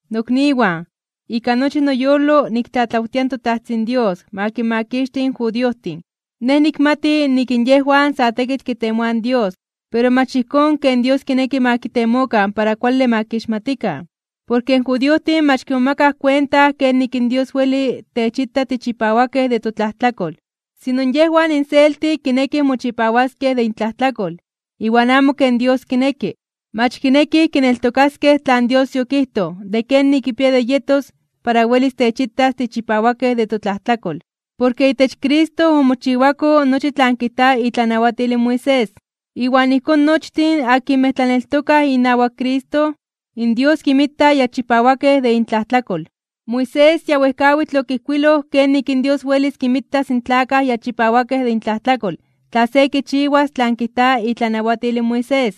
Nokniwan, ika nochi noyolo niktlatlawtia in toTajtzin Dios ma kinmakixti in judiojtin. Nej nikmati nik in yejwan sa tekitl kitemoaj in Dios, pero mach ijkón ken Dios kineki ma kitemokan para kuale ma kixmatikan. Porke in judiojtin mach kimomakaj kuenta kenik in Dios weli techita tichipawakej de totlajtlakol. Sino yejwan inselti kinekij mochipawaskej de intlajtlakol, iwan amo ken Dios kineki. Mach kinekij kineltokaskej tlan Dios yokijtoj de kenik kipia de yetos para welis techitas tichipawakej de totlajtlakol. Porke itech Cristo omochiwako nochi tlan kijta itlanawatil in Moisés. Iwan ijkón nochtin akinmej tlaneltokaj inawak Cristo, in Dios kinmita ya chipawakej de intlajtlakol. Moisés ya wejkawitl okijkuiloj kenik in Dios welis kinmitas in tlakaj ya chipawakej de intlajtlakol tla se kichiwas tlan kijta itlanawatil in Moisés.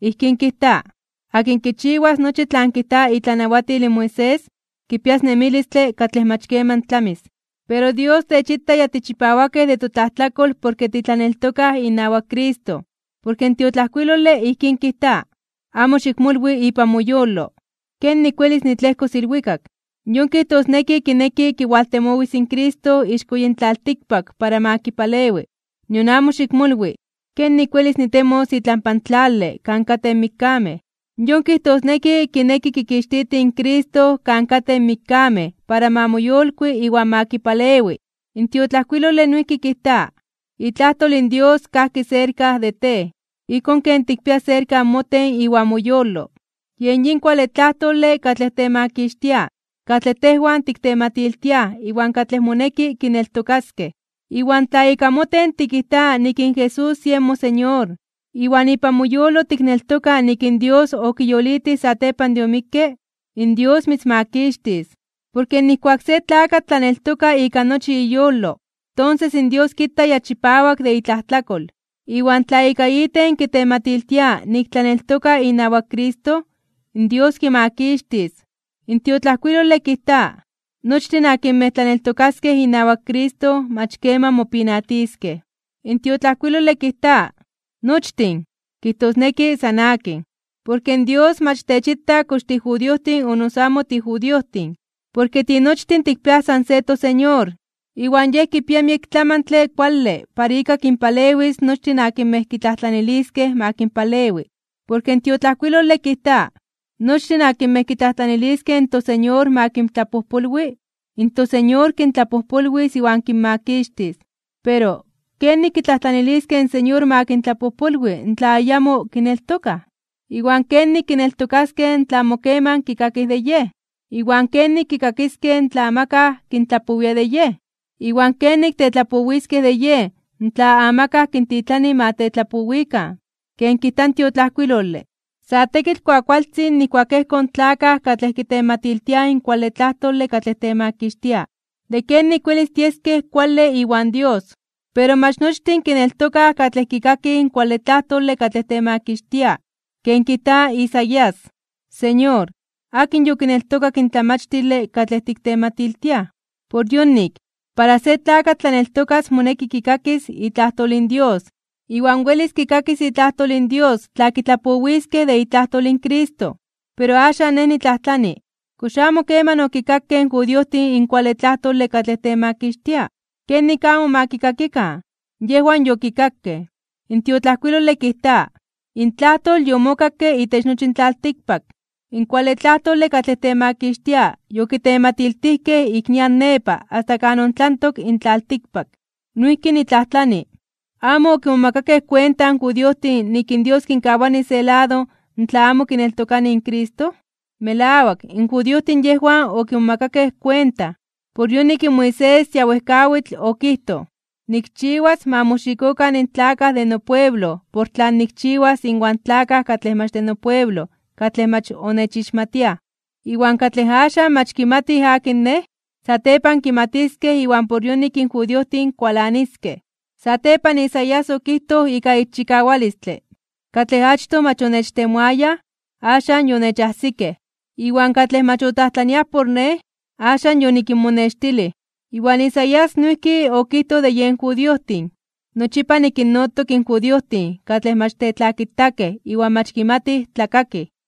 Ijkín kijta: “Akin kichiwas nochi tlan kijta itlanawatil in Moisés, kipias nemilistle katlej mach keman tlamis.” Pero Dios techita ya tichipawakej de totlajtlakol porke titlaneltokaj inawak Cristo, porke in tiotlajkuilole ijkín kijta: “Amo xikmolwi ipan moyolo, ¿kenik welis nitlejkos ilwikak?” Yon kijtosneki kineki kiwaltemowis in Cristo ixko yin tlaltikpak para ma kipalewi. Nion amo xikmolwi: “¿Kenik welis nitemos itlampa tlale kan katej in mikkamej?” Yon kijtosneki kineki kikixtiti in Cristo kan katej in mikkamej para ma moyolkui iwan ma kipalewi. In tiotlajkuilole noijki kijta: “Itlajtol in Dios kajki serka de tej, ijkón ken tikpia serka moten iwan moyolo.” Yen yin kuale tlajtole katlej temakixtia katlej tejwan tiktematiltiaj iwan katlej moneki kineltokaskej. Iwan tla ika moten tikijta nik in Jesús yen moSeñor, iwan ipan moyolo tikneltoka nik in Dios okiyolitij satepan de omikke, in Dios mitzmakixtis. Porke nijkuak se tlakatl tlaneltoka ika nochi iyolo, tonses in Dios kita ya chipawak de itlajtlakol. Iwan tla ika iten kitematiltia nik tlaneltoka inawak Cristo, in Dios kimakixtis. In tiotlajkuilole kijta: “Nochtin akinmej tlaneltokaskej inawak Cristo mach keman mopinatiskej.” In tiotlajkuilole kijta “nochtin”, kijtosneki san akin, porke in Dios mach techita kox tijudiojtin o noso amo tijudiojtin. Porke tinochtin tikpiaj san se toSeñor. Iwan Yej kipia miek tlamantle kuale para ika kinpalewis nochtin akinmej kitlajtlaniliskej ma kinpalewi. Porke in tiotlajkuilole kijta: “Nochtin akinmej kitlajtlaniliskej in toSeñor ma kintlapojpolwi, in toSeñor kintlapojpolwis iwan kinmakixtis.” Pero, ¿kenik kitlajtlaniliskej in Señor ma kintlapojpolwi tla ayamo kineltokaj? ¿Iwan kenik kineltokaskej tla amo keman kikakij de Yej? ¿Iwan kenik kikakiskej tla amakaj kintlapowia de Yej? ¿Iwan kenik tetlapowiskej de Yej tla amakaj kintitlani ma tetlapowikan? Ken kijta in tiotlajkuilole: “Sa tekitl kuakualtzin nijkuak ejkoj in tlakaj katlej kitematiltiaj in kuale tlajtole katlej temakixtia, de kenik welis tieskej kuale iwan Dios.” Pero mach nochtin kineltokaj katlej kikakij in kuale tlajtole katlej temakixtia. Ken kijta in Isaías: “Señor, ¿akin yokineltokak in tlamachtile katlej tiktematiltiaj?” Por yonik, para se tlakatl tlaneltokas moneki kikakis itlajtol in Dios. Iwan welis kikakis itlajtol in Dios tla kitlapowiskej de itlajtol in Cristo. Pero axan nej nitlajtlani: ¿Kox amo keman okikakej in judiojtin in kuale tlajtole katlej temakixtia? ¡Kenik amo ma kikakikan! Yejwan yokikakej. In tiotlajkuilole kijta: Intlajtol yomokakke itech nochi in tlaltikpak. In kuale tlajtole katlej temakixtia yokitematiltijkej ik nian nepa asta kan ontlantok in tlaltikpak. Noijki nitlajtlani: ¿Amo okimomakakej kuenta in judiojtin nik in Dios kinkawani se lado tla amo kineltokanij in Cristo? Melawak, in judiojtin yejwan okimomakakej kuenta. Por yonik in Moisés ya wejkawitl okijtoj: Nikchiwas ma moxikokan in tlakaj de nopueblo por tlan nikchiwas inwan tlakaj katlej mach de nopueblo katlej mach onechixmatiaj. Iwan katlej axan mach kimatij akin Nej, satepan kimatiskej iwan por yonik in judiojtin kualaniskej. Satepan, Isaías okijtoj ika ixchikawalistle: Katlej achtoj mach onechtemoayaj, axan yonechajsikej. Iwan katlej mach otlajtlaniaj por Nej, axan yonikinmonextilij. Iwan Isaías noijki okijtoj de yen judiojtin: “Nochipa nikinnotok in judiojtin katlej mach tetlakitakej iwan mach kimatij tlakakij.”